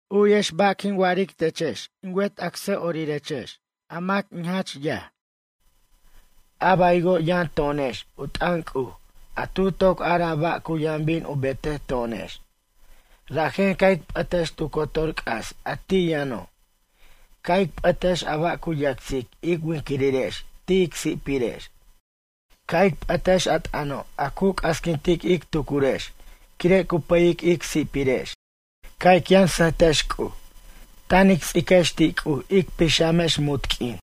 U'yex ba' quin wa'aric techex in wet acsa'orirex, a mac in jach yaj. A baywo' yʌn to'onex u t'ʌn C'uj a tu toc araj ba' cu yʌn bin u betej to'onex. Rajen ca' ic p'ʌtex tu cotor c'as a ti' yʌno'. Ca' ic p'ʌtex a ba' cu yacsic ic winquirirex ti' ic si'pirex. Ca' ic p'ʌtex a t'ʌno' a cu c'asquintic ij tucurex quire' cu pʌyic ic si'pirex. Ca' ic yʌn sʌjtex C'uj. Tan ic ts'iquex ti' C'uj ic pixamex munt q'uin.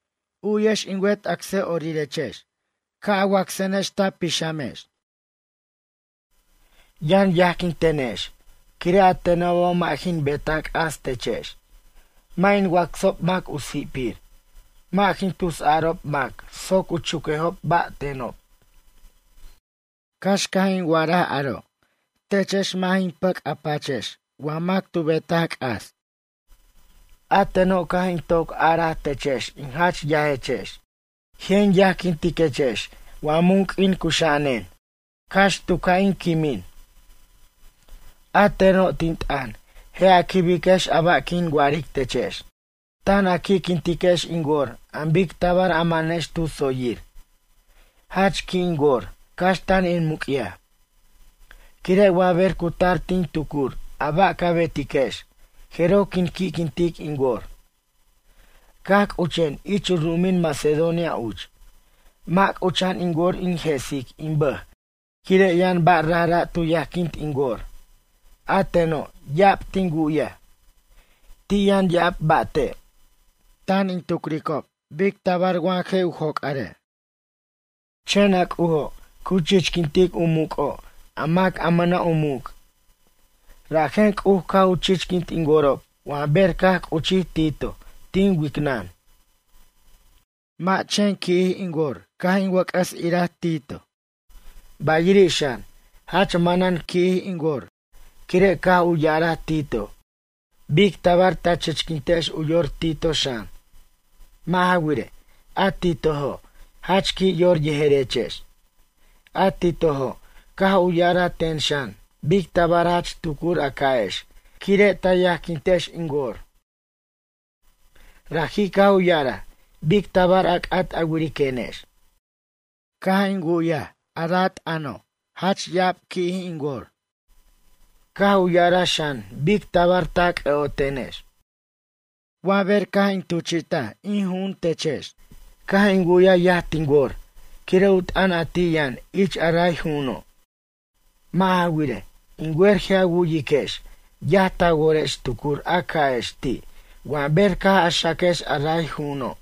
U'yex in wet acsa'orirex ca' a wacsenex ta pixamex. Yʌn yajquintenex quire' a tenobo' mʌ' jin beta c'as techex, mʌ' in wacsob mac u si'pir, mʌ' jin tusarob mac soc u chuquejob ba' tenob. Cax caj in wa'araj aro' techex mʌ' jin pʌc' a pachex wa mac tu betaj c'as. A teno' caj in toc araj techex in jach yajechex. Je' in yajquintiquechex wa mun q'uin cuxa'anen, cax tu ca' in quimin. A teno', tin t'ʌn je' a quibex a ba' quin wa'aric techex. Tan a qui'quintiquex in wor an bic tabar a manex tu tsoyir. Jach qui' in wor cax tan in muc'yaj, quire' wa ber cu tar tin tucur a ba' ca betiquex jeroj quin qui'quintic in wor. Caj c'uchen ich u ru'umin Macedonia uch, mʌ' c'ucha'an in wor in je'sic in bʌj quire' yʌn ba' rajra' tu yajquint in wor, a teno' ya'ab tin wu'yaj. Ti' yʌn ya'ab ba'te'. Tan in tucricob bic tabar wa je' joc'are'. Chen a C'ujo' cu chichquintic u muc'o' a mac a mʌna' u muc', rajen C'uj caj u chichquint in worob wa ber caj c'uchij Tito tin wicnʌn. Mʌ' chen qui'jij in wor caj in wʌc'ʌs iraj Tito, bayiri' xan jach manan qui'jij in wor quire' caj u ya'araj Tito bic tabar ta chichquintex u yor Tito xan. Mʌ' ja wirej, a Titojo' jach qui' yor yejerechex. A Titojo' caj u ya'araj ten xan bic tabar jach tucur a ca'ex quire' ta yajquintex in wor. Raji' caj u ya'araj bic tabar a c'at a wiriquenex. Caj in wu'yaj a ra' t'ʌno' jach ya'ab qui'jij in wor. Caj u ya'araj xan bic tabar ta c'ʌ'otenex. Wa ber caj in tuchi't in ju'un techex, caj in wu'yaj yaj tin wor quire' u t'ʌn a ti' yʌn ich a ray ju'uno'. Mʌ' ja wirej, in wer je' a wu'yiquex yaj ta worex tucur a ca'ex ti' wa ber caj a xaquex a ray ju'uno'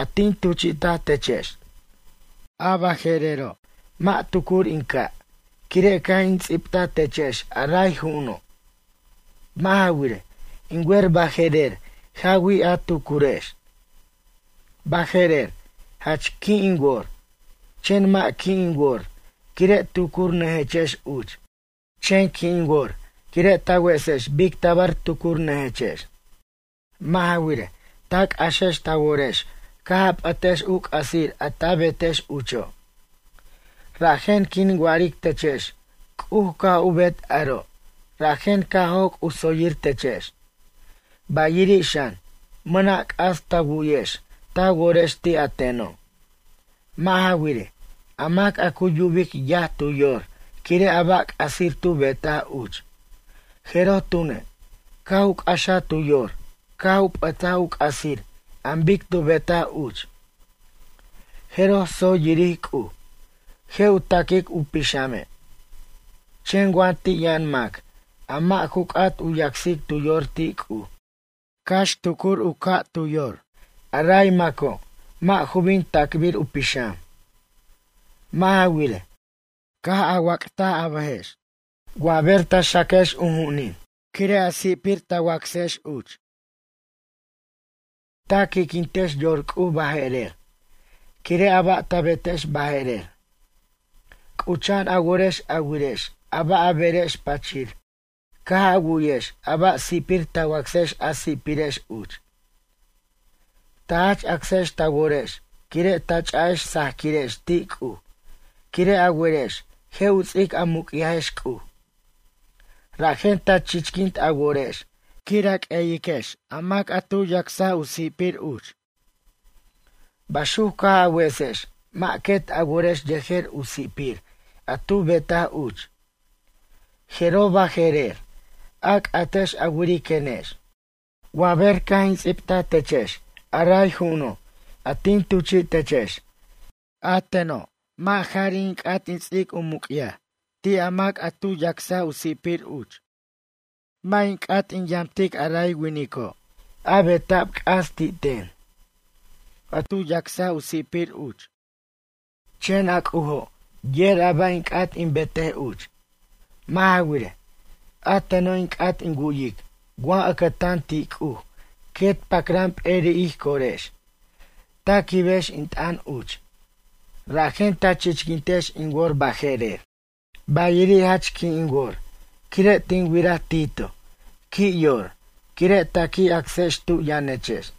a tin tuchi'ta techex. A baje'rero' mʌ' tucur in ca' quire' caj in ts'ibta techex a ray ju'uno'. Mʌ' ja wirej, in wer baje'rer jawij a tucurex. Baje'rer jach qui' in wor, chen mʌ' qui' in wor quire' tucurnʌjechex uch. Chen qui' in wor quire' ta wesex bic tabar tucurnʌjechex. Mʌ' ja wirej, ta c'axex ta worex caj a p'ʌtex u c'asir a ta betex ucho'. Rajen quin wa'aric techex C'uj caj u bet aro' rajen caj joc' u tsoyir techex. Bayiri' xan, mʌna' c'as ta wu'yex ta worex ti' a teno'. Mʌ' ja wirej, a mac a cu yubic yaj tu yor quire' a ba' c'asir tu betaj uch, jeroj tune' caj u c'axaj tu yor caj u p'ʌtaj u c'asir an bic tu betaj uch. Jeroj tsoy yiric C'uj, je' u ta'quic u pixame'. Chen wa ti' yʌn mac a mʌ' ju c'at u yacsic tu yor ti' C'uj cax tucur u caj u yor, a ray maco' mʌ' ju bin ta'cbir u pixam. Mʌ' ja wirej, caj a wac't a bʌjex wa ber ta xaquex u ju'unin quire' a si'pir ta wacsex uch. Ta qui'quintex yor C'uj baje'rer quire' a ba' ta betex baje'rer. C'ucha'an a worex a wirex a ba' a berex pachir caj a wu'yex a ba' si'pir ta wacsex a si'pirex uch. Ta jach acsex ta worex quire' ta ch'a'ex sajaquirex ti' C'uj quire' a werex je' u ts'ic a muc'yajex C'uj. Rajen ta chichquint a worex quir a q'ueyiquex a mac a tu yacs u si'pir uch. Baxuc caj a wesex mʌ' quet a worex yejer u si'pir a tu betaj uch. Jeroj baje'rer a c'atex a wiriquenex. Wa ber caj in ts'ibtaj techex a ray ju'uno' a tin tuchi'techex, a teno' mʌ' jari' in c'at in ts'ic u muc'yaj ti' a mac a tu yacs u si'pir uch. Mʌ' in c'at in yamt aray winico', a beta'b c'as ti' ten, a tu yacs u si'pir uch. Chen a C'ujo' yer a ba' in c'at in betej uch. Mʌ' ja wirej, a teno' in c'at in wu'yic wa ʌcʌtan ti' C'uj quet pacran p'eri' ij corex, ta quibex in t'ʌn uch. Rajen ta chichquintex in wor baje'rer. Bayiri' jach qui' in wor quire' tin wiraj Tito qui' yor quire' ta qui' acsex tu yʌnechex.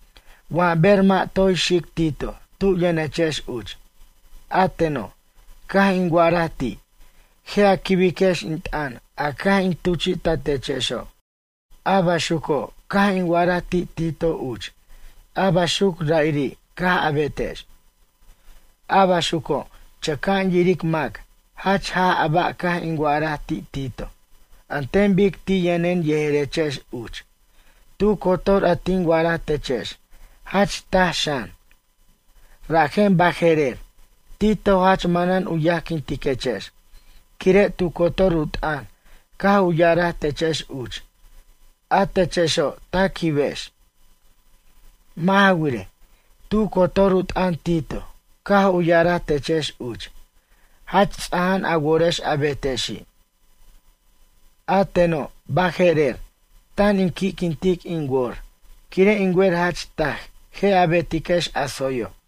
Wa ber mʌ' toy xic Tito tu yʌnechex uch, a teno' caj in wa'araj ti', je' a quibiquex in t'ʌn a caj in tuchi'tatechexo'. A baxuco' caj in wa'araj ti' Tito uch a baxuc ra'iri' caj a betex. A baxuco' chʌca'an yiric mac jach jaj a ba' caj in wa'araj ti' Tito an ten bic ti' yʌnen yejerechex uch, tu cotor a tin wa'araj techex jach taj xan. Rajen baje'rer Tito jach manan u yajquintiquechex quire' tu cotor u t'ʌn caj u ya'araj techex uch a techexo' ta quibex. Mʌ' ja wirej, tu cotor u t'ʌn Tito caj u ya'araj techex uch jach ts'aja'an a worex a betexi'. A teno', baje'rer, tan in qui'quintic in wor quire' in wer jach taj je' a betiquex a tsoyo'.